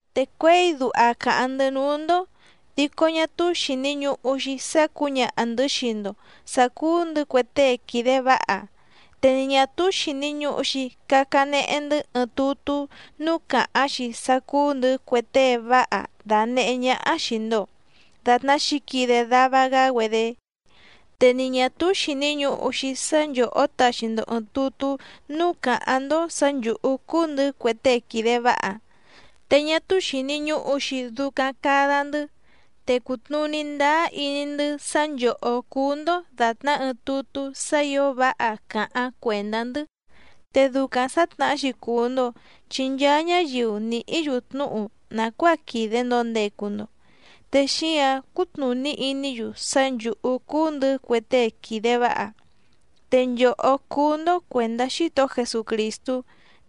Te cuěi duha càháⁿ‑ndɨ́ núú‑ndó dico ñá túú xìni ñuhu‑xi sá cǔñaha‑ndɨ̌ xii‑ndo sǎ cúú‑ndɨ̌ cue tée quìde váha, te ni ñà túú xìni ñuhu‑xi cacanehe‑ndɨ́ ɨɨⁿ tutú núú càháⁿ‑xi sá cúú‑ndɨ̌ cue tée váha danèhé ñáhá xìi‑ndo datná xǐquide dava‑gá‑güedé, te ni ñà túú xìni ñuhu‑xi sá nchòhó taxi‑ndo ɨ̀ɨⁿ tutú núú càháⁿ‑ndó sǎ nchǔhú cúú‑ndɨ̌ cue tée quìde váha. Te ñá túú xìni ñuhu‑xi ducaⁿ cada‑ndɨ́. Te cùtnuní ndáá iní‑ndɨ́ sá nchòhó cúú‑ndó dàtná ɨɨⁿ tutú sá ǐo váha càháⁿ cuèndá‑ndɨ́. Te ducaⁿ sǎtnahá‑xi cùu‑ndo chi nchaa ñáyiu nìhí‑yu tnúhu nàcuáa quìde‑ndo ndecu‑ndo, te xíǎⁿ cútnùní iní‑yu sá nchǔhú cúú‑ndɨ̌ cue tée quìde váha. Te nchòhó cúú‑ndó cuèndá Xítohó Jesucrìstú,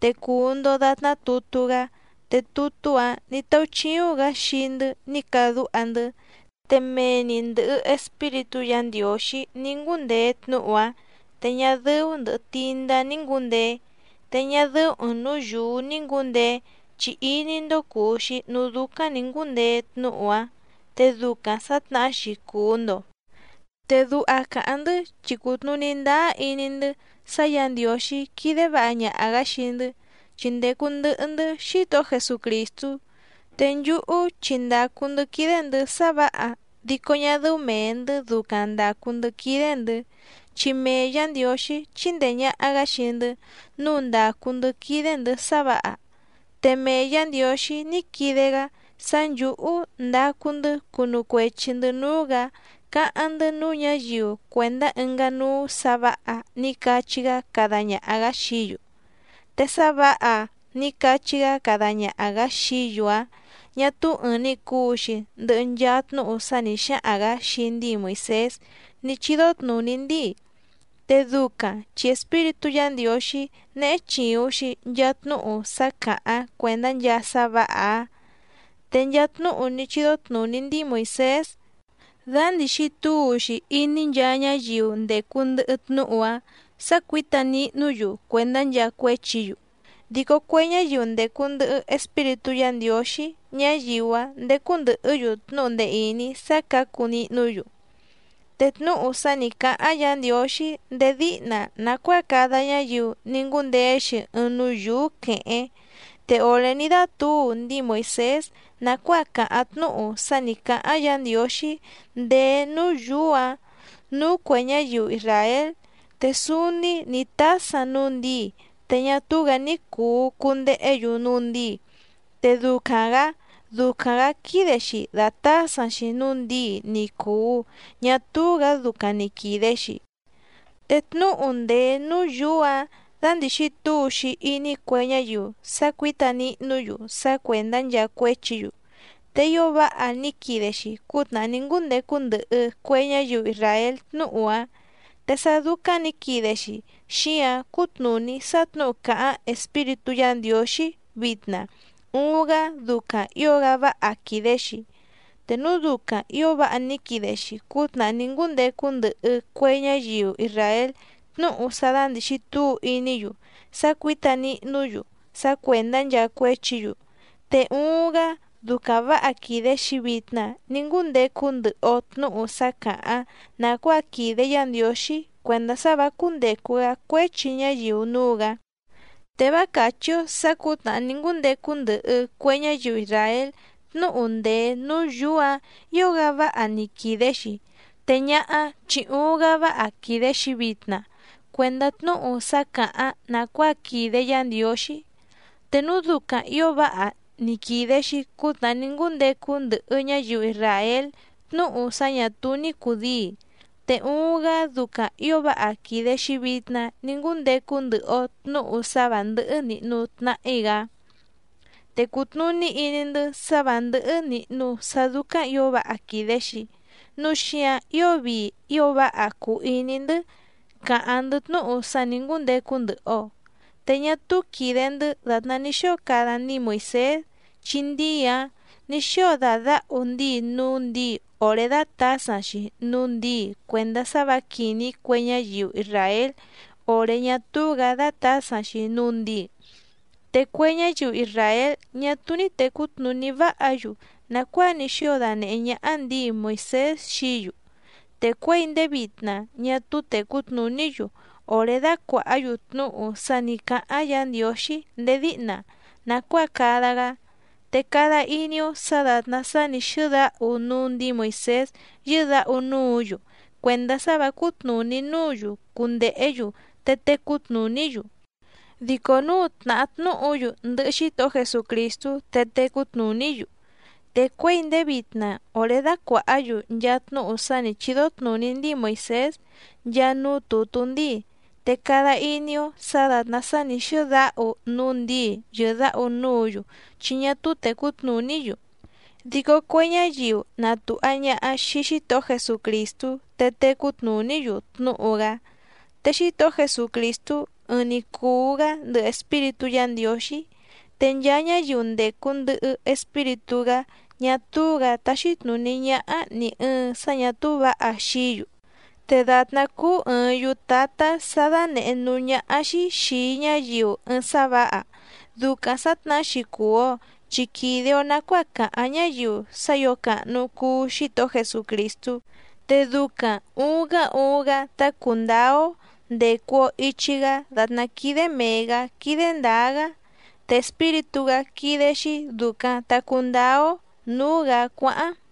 te cùu‑ndo datná tutú‑gá te tutú‑áⁿ nǐ táúchíúⁿ‑gǎ xii‑ndɨ́ ní cadúha‑ndɨ́, te mee‑ni ndɨ̀hɨ Espíritú Yǎ Ndiǒxí ní ngúndeé tnúhu‑áⁿ te ñá dɨ́ú ndɨ̀hɨ tindá ní ngúndeé. Te ñá dɨ́ú ɨ̀ɨⁿ núú yǔú ní ngǔndeé chi iní‑ndó cùu‑xi núú dúcáⁿ nǐ ngúndeé tnúhu‑áⁿ te ducaⁿ sǎtnahá‑xi cùu‑ndo. Te duha càháⁿ‑ndɨ́ chi cùtnuní ndáá iní‑ndɨ́ sá Yǎ Ndiǒxí quídé vǎha ñaha‑gǎ xii‑ndɨ́, chi ndècu ndɨhɨ‑ndɨ́ Xítohó Jesucrìstú. Te nchúhú chi ndàcu‑ndɨ́ quídé‑ndɨ̌ sá vǎha dico ñá dɨ́ú mèe‑ndɨ́ ducaⁿ ndàcu‑ndɨ́ quídé‑ndɨ̌, chi mee Yǎ Ndiǒxí chíndèe ñaha‑gá xii‑ndɨ́ nǔu ndàcu‑ndɨ́ quídé‑ndɨ̌ sá vǎha. Te mee Yǎ Ndiǒxí ní quide‑gá sá nchǔhú ndacu‑ndɨ́ cunu cuechi‑ndɨ̌ núú‑gǎ cáháⁿ‑ndɨ́ núú ñǎyiu cuèndá ɨngá núú sǎ vǎha ní cachí‑gá cada ñaha‑gǎ xií‑yu. Te sá vǎha ní cachí‑gá cada ñaha‑gǎ xií‑yu‑áⁿ ñà túú ɨ̀ɨⁿ‑ni cuu‑xi ndɨhɨ nchaa tnúhu sá nǐ xáhaⁿ‑gǎ xii ndíi Moìsés ní chídó tnùní ndíi, te ducaⁿ chi espíritú Yǎ Ndiǒxí néhé chìuⁿ‑xi nchaa tnúhu sá càháⁿ cuèndá nchaa sá vǎha‑áⁿ. Te nchaa tnúhu ní chídó tnùní ndíi Moìsés, dándìxi túu‑xi iní nchaa ñáyiu ndècu ndɨhɨ tnúhu‑áⁿ sǎ cuǐta nihnú‑yu cuèndá nchaa cuéchi‑yu, dico cue ñáyiu ndècu ndɨhɨ Espíritú Yǎ Ndiǒxí ñáyiu‑áⁿ ndécú ndɨ̀hɨ́‑yu tnúhu ndee ìní sá cǎcu nihnú‑yu. Te tnúhu sá nǐ cáháⁿ Yǎ Ndiǒxí ndéé díhna nàcuáa cada ñáyiu ní ngúndeé‑xi ɨɨⁿ núú yǔú quèhéⁿ. Te òré ní dátǔu ndíi Moìsés nàcuáa càháⁿ tnúhu sá nǐ cáháⁿ Yǎ Ndiǒxí ndèé núú yǔú‑ǎⁿ nǔú cuè ñáyiu isràél, te súúní nǐ tásaⁿ núú ndǐi te ñá túú‑gǎ ní cùu cundehé‑yu núú ndǐi, te ducaⁿ‑gǎ ducaⁿ‑gǎ quídé‑xí dàtásaⁿ‑xi núú ndǐi ni cùu ñá túú‑gǎ ducaⁿ ni quìde‑xi. Te tnúhu ndèé núú yǔú‑ǎⁿ dándìxi túu‑xi iní cue ñáyiu sá cuǐta nihnú‑yu sá cuèndá nchaa cuéchi‑yu, te ío váha ní quide‑xi cútnàhá ní ngúndecu ndɨhɨ cue ñáyiu isràél tnúhu‑áⁿ. Te sá dúcáⁿ nǐ quide‑xi xíáⁿ cútnùní sá tnǔhu càháⁿ Espíritú Yǎ Ndiǒxí vitna uuⁿ‑gá ducaⁿ ǐo‑gá váha quìde‑xi. Te núu ducaⁿ ǐo váha ní quide‑xi cútnàhá ní ngúndecu ndɨhɨ cue ñáyiu isràél tnúhu sá dándìxi túu iní‑yu sá cuǐta nihnú‑yu sá cuèndá nchaa cuéchi‑yu, te uuⁿ‑gá ducaⁿ vǎha quìde‑xi vitna ní ngúndecu ndɨhɨ‑o tnǔhu sá càháⁿ nàcuáa quìde Yá Ndiǒxí cuèndá sá vǎ cúndècu‑gá cuéchi ñáyiu núú‑gǎ. Te vá càchí‑ó sǎ cǔtnàhá ní ngúndecu ndɨhɨ cue ñáyiu isràél tnúhu ndèé núú yǔú‑ǎⁿ ǐo‑gá váha ní quide‑xi, te ñáhá chi uuⁿ‑gá váha quìde‑xi vitna cuendá tnúhu sá càháⁿ nàcuáa quìde Yá Ndiǒxí. Te núu ducaⁿ ǐo váha ní quide‑xi cútnàhá ní ngúndecu ndɨhɨ ñáyiu isràél tnúhu sá ñà túú ní cùdíi, te uuⁿ‑gá ducaⁿ ǐo váha quìde‑xi vitna ní ngúndecu ndɨhɨ‑o tnǔhu sá vǎ ndɨ́hɨ́ nìhnu tnahí‑gá. Te cùtnuní iní‑ndɨ́ sá vǎ ndɨ́hɨ́ nìhnu sá dúcáⁿ ǐo váha quìde‑xi, núu xíǎⁿ ío vii ío váha cùu iní‑ndɨ́ càháⁿ‑ndɨ́ tnúhu sá nǐ ngúndecu ndɨhɨ‑o. Te ñá túú quìde‑ndɨ́ dàtná ní xóo cada ndíi Moìsés, chi ndíi‑áⁿ nǐ xóo dàdáhu ndíi núú ndǐi òré dátǎsaⁿ‑xi núú ndǐi cuèndá sá vǎ quìní cue ñáyiu isràél òré ñá túú‑gǎ dátǎsaⁿ‑xi núú ndǐi. Te cue ñáyiu isràél ñá túú ní tècú tnùní váha‑yu nàcuáa ní xóo danèhé ñáhá ndǐi Moìsés xií‑yu, te cuěi ndéé vitna ñá túú tècú tnùní‑yu òré dácuàhá‑yu tnúhu sá nǐ cáháⁿ Yǎ Ndiǒxí ndéé díhna nàcuáa cada‑gá, te cada iní‑ó sǎ dàtná sá nǐ xɨ́dáhu núú ndǐi Moìsés yɨ́dǎhu núǔ‑yu cuèndá sá vǎ cútnùní núǔ‑yu cundèhé‑yu te tecú tnùní‑yu, dico núu tnahá tnúhu‑yu ndɨhɨ Xítohó Jesucrìstú te tecú tnùní‑yu. Te cuěi ndéé vitna òré dácuàhá‑yu nchaa tnúhu sá nǐ chídó tnùní ndíi Moìsés nchaa núú tùtú ndíi, te cada iní‑ó sǎ dàtná sá nǐ xɨ́dáhu núú ndǐi yɨ̀dáhu núǔ‑yu chi ñá túú tècú tnùní‑yu. Dico cue ñáyiu na tùha ñaha xii Xítohó Jesucrìstú te tècú tnùní‑yu tnúhu‑gá. Te Xítohó Jesucrìstú ɨɨⁿ‑ni cùu‑gá ndɨhɨ Espíritú Yǎ Ndiǒxí, te nchaa ñáyiu ndècu ndɨhɨ Espíritú‑gá ñá túú‑gǎ táxí tnùní ñáhá nì ɨɨⁿ sá ñà túú vǎha xií‑yu. Te dàtná cúú ɨ̀ɨⁿ yutátá sǎ dánèhé núú ñáhá‑xí xìi ñáyiu ɨɨⁿ sá vǎha, ducaⁿ sǎtnahá‑xi cùu‑o chi quìde‑o nacuáa cáháⁿ ñáyiu sá ǐo càhnu cuu Xítohó Jesucrìstú, te ducaⁿ ùuⁿ‑gá uuⁿ‑gá tá cùndáá‑ó ndècu‑o ichi‑gá dàtná quídé mèe‑gá quídé ndǎá‑gá. Te Espíritú‑gá quídé‑xí dùcaⁿ ta cundáá‑ó nǔú‑gǎ cuáháⁿ.